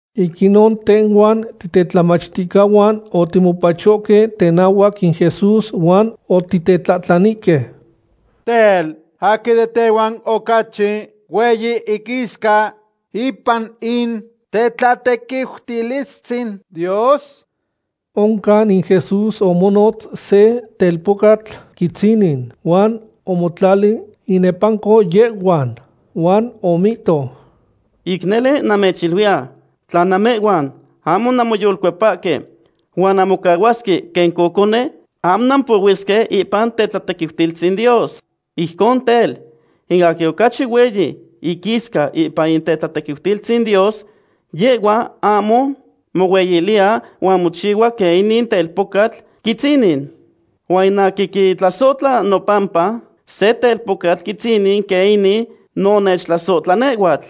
Ic inon tehhuan titetlamachticahuan otimopachohque tenahuac in Jesús huan otitetlahtlanihque: ―Tel, ¿aquin de tehhuan ocachi hueyi iquisca ipan in tetlatequiutilistzin Dios? Oncan in Jesús omonotz se telpocatl quitzinin huan omotlali inepanco yehhuan. Huan omihto: ―Ic nele namechiluiya, tla namehhuan ahmo nanmoyolcuepahque huan nanmocahuasque quen cocone, ahmo nampohuisque ipan tetlatequiutilistzin Dios. Ijcon tel, in aquin ocachi hueyi iquisca ipan in tetlatequiutilistzin Dios, yehhua ahmo mohueyiliya huan mochihua quen inin telpocatl quitzinin. Huan in aquin quitlasohtla nopampa se telpocatl quitzinin quen inin, no nechtlasohtla nehhuatl.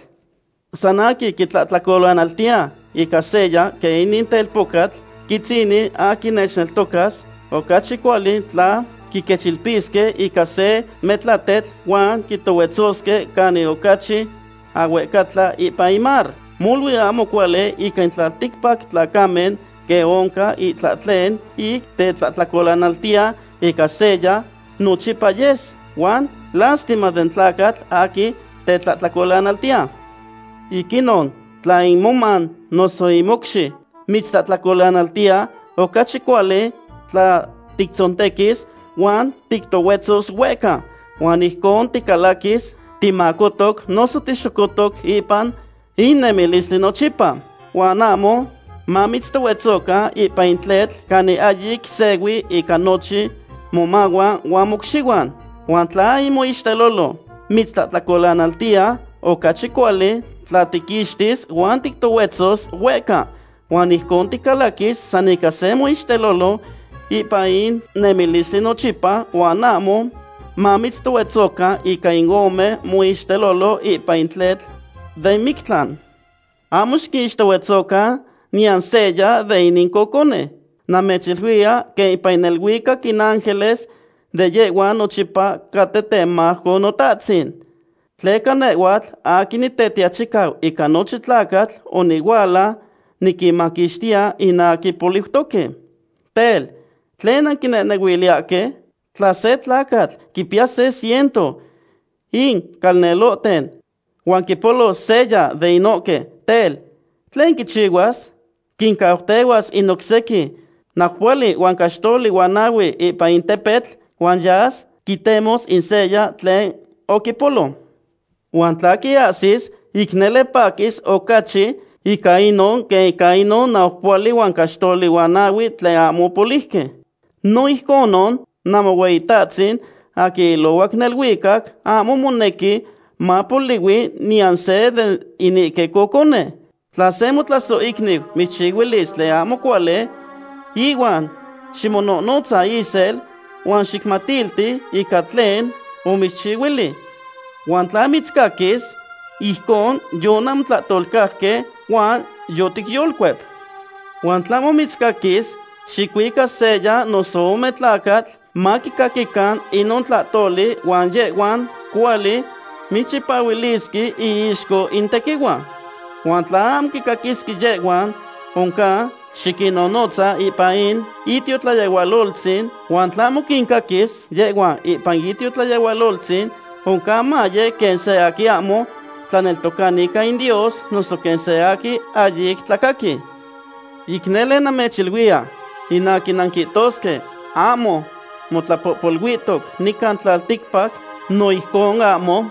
’San aquin quitlahtlacolanaltiya ica seya quen inin telpocatl quitzinin aquin nechneltocas, ocachi cuali tla quiquechilpisque ica se metlatetl huan quitohuetzosque canin ocachi ahuehcatla ipan in mar. ¡Molui ahmo cuali ica in tlalticpac tlacamen quen oncan itlahtlen ic tetlahtlacolanaltiya ica seya! Nochipa yes, huan ¡lastima den tlacatl aquin tetlahtlacolanaltiya! ’Ic inon, tla in moman noso in mocxi mitztlahtlacolanaltiya, ocachi cuali tla tictzontequis, huan tictohuetzos huehca, huan ijcon ticalaquis timacotoc noso tixocotoc ipan in nemilistli nochipa, huan ahmo mamitztohuetzocan ipan in tletl canin ahyic sehui ica nochin momahuan huan mocxihuan. Huan tla in moixtelolo mitztlahtlacolanaltiya, ocachi cuali tla tiquixtis huan tictohuetzos huehca. Huan ijcon ticalaquis san ica se moixtelolo ipan in nemilistli nochipa huan ahmo mamitztohuetzocan ica in ome moixtelolo ipan in tletl den mictlan. ’Ahmo xiquixtohuetzocan niyan seya de inin cocone. Namechiluiya quen ipan neluicac in ángeles de yehhuan nochipa caten temajco Notatzin. Tleca nehhuatl aquin Nitetiachicau ica nochin tlacatl onihuala niquinmaquixtiya in aquin poliutoque. ’Tel, ¿tlen nanquinehnehuiliyahque? Tla se tlacatl quimpiya se ciento in calnelohten huan quipolos seya de inohque, tel, ¿tlen quichihuas? Quincautehuas in oc sequin naupohuali huan caxtoli huan nahue ipan in tepetl, huan yas quitemos in seya tlen oquipolo. Huan tla quiahsis, ic nele paquis ocachi ica inon quen ica inon naupohuali huan caxtoli huan nahue tlen ahmo opoliuque. No ijconon Namohueyitatzin aquin ilohuac neluicac ahmo monequi mapolihui niyan se de inihque cocone. ’Tla se motlasohicniu mitzchihuilis tlen ahmo cuali, ihuan ximonohnotza isel huan xicmatilti ica tlen omitzchihuili. Huan tla mitzcaquis, ijcon yonanmotlahtolcajque huan yoticyolcuep. Huan tla ahmo mitzcaquis, xicuica seya noso ome tlacatl maquicaquican inon tlahtoli huan yehhuan cuali mitzchipahuilisque iixco in tequihua. Huan tla ahmo quincaquis yehhuan, oncan xiquinnonotza ipan in itiotlayehualoltzin, huan tla ahmo quincaquis yehhuan ipan in itiotlayehualoltzin, oncan maye quen seya aquin ahmo tlaneltocani ica in Dios noso quen se aquin ahyic tlacaqui. ’Ic nele namechiluiya, in aquin nanquihtosque ahmo motlapohpoluihtoc nican tlalticpac no ijcon ahmo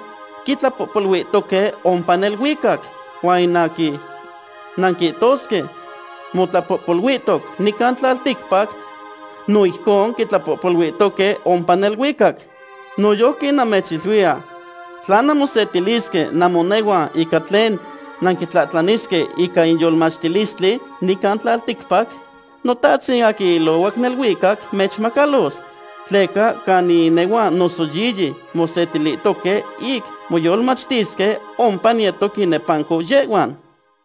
quitlapohpoluihtoque ompa neluicac. Huan in aquin nanquihtosque motlapohpoluihtoc nican tlalticpac, no ijcon quitlapohpoluihtoque ompa neluicac. ’Noyojqui namechiluiya, tla nanmosetilisque namonehuan ica tlen nanquitlahtlanisque ica in yolmachtilistli nican tlalticpac, Notahtzin aquin ilohuac neluicac mechmacalos. Tleca canin inehuan noso yiyi mosetilihtoque ic moyolmachtisque, ompa niyetos inepanco yehhuan.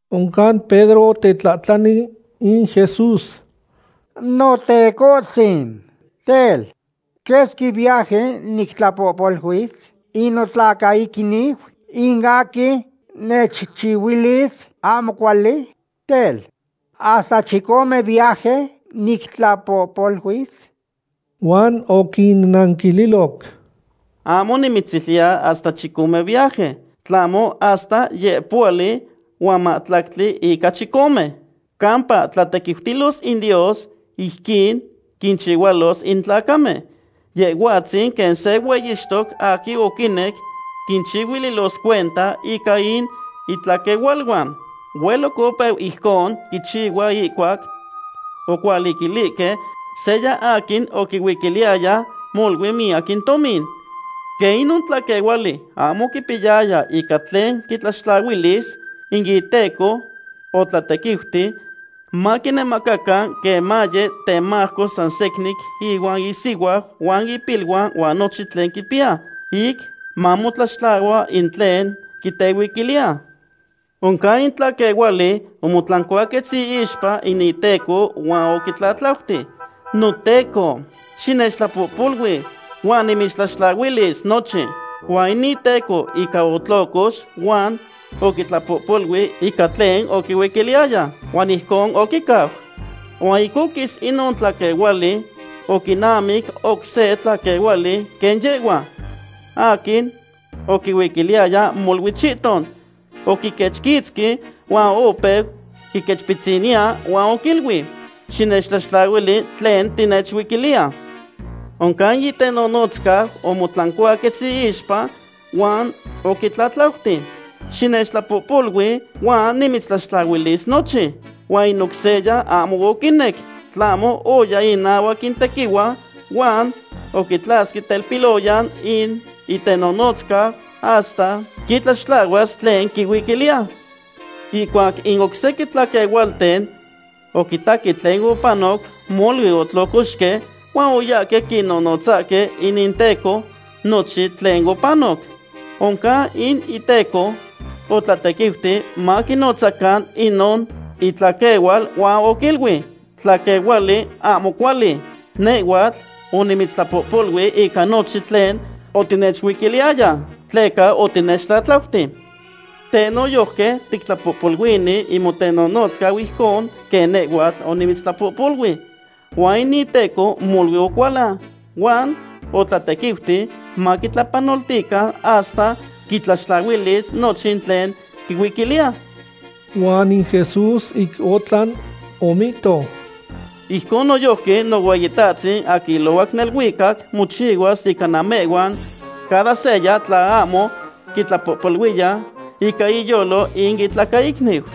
Oncan Pedro otetlahtlani in Jesús: ―Notecohtzin, tel, ¿quesqui viaje nictlapohpoluis in notlacaicniu in aquin nechchihuilis ahmo cuali? Tel, ¿hasta chicome viaje nictlapohpoluis? Huan oquinanquililoc: ―Ahmo nimitziluiya hasta chicome viaje, tlahmo hasta yeupohuali huan mahtlactli ica chicome. ’Campa tlatequiutilos in Dios ijquin quinchihualos in tlacamen. Yehhuatzin quen se hueyixtoc aquin oquinec quinchihuililos cuenta ica in itlaquehualuan. Hueloc opeu ijcon quichihua ihcuac ocualiquilihque seya aquin oquihuiquiliyaya molui miyac in tomin. Quen inon tlaquehuali ahmo oquipiyaya ica tlen quitlaxtlahuilis, in iteco otlatequiuti maquinemacacan quen maya temajco san secnin ihuan isihuau huan ipiluan huan nochin tlen quipiya, ic mamotlaxtlahua in tlen quitehuiquiliya. Oncan in tlaquehuali omotlancuaquetz iixpa in iteco huan oquitlatlautic: “Noteco, xinechtlapohpolui huan nimitztlaxtlahuilis nochin.” Huan in iteco ica otlocox huan oquitlapohpolui ica tlen oquihuiquiliyaya. Huan ijcon oquicau. Huan ic oquis inon tlaquehuali, oquinamic oc se tlaquehuali quen yehhua, aquin oquihuiquiliyaya molui chihton. Oquiquechquitzqui huan opeu quiquechpitziniya huan oquiluic: “¡Xinechtlaxtlahuili tlen nechuiquiliya!” Oncan in itenonotzcau omotlancuaquetz iixpa huan oquitlatlauti: “Xinechtlapohpolui huan nimitztlaxtlahuilis nochin.” Huan in oc seya ahmo oquinec, tlahmo oya inahuac in tequihua huan oquitlasque telpiloyan in itenonotzcau hasta quitlaxtlahuas tlen quihuiquiliya. Ihcuac in oc sequin tlaquehualten oquitaque tlen opanoc, molui otlocoxque huan oyahque quinonotzahque in inteco nochin tlen opanoc. Oncan in iteco otlatequiuti maquinotzacan inon itaquehual, huan oquiluic: “¡Tlaquehuali ahmo cuali! Nehhuatl onimitztlapohpolui ica nochin tlen otinechuiquiliyaya, tleca otinechtlatlauti. Teh noyojqui tictlapohpoluini in motenonotzcau ijcon quen nehhuatl onimitztlapohpolui.” Huan in iteco molui ocualan, huan otlatequiuti maquitlapanoltican hasta quitlaxtlahuilis nochin tlen quihuiquiliya. Huan in Jesús ic otlan omihto: ―Ijcon noyojqui Nohueyitahtzin aquin ilohuac neluicac mochihuas ica namehhuan cada seya tla ahmo quitlapohpoluiya ica iyolo in itlacaicniu.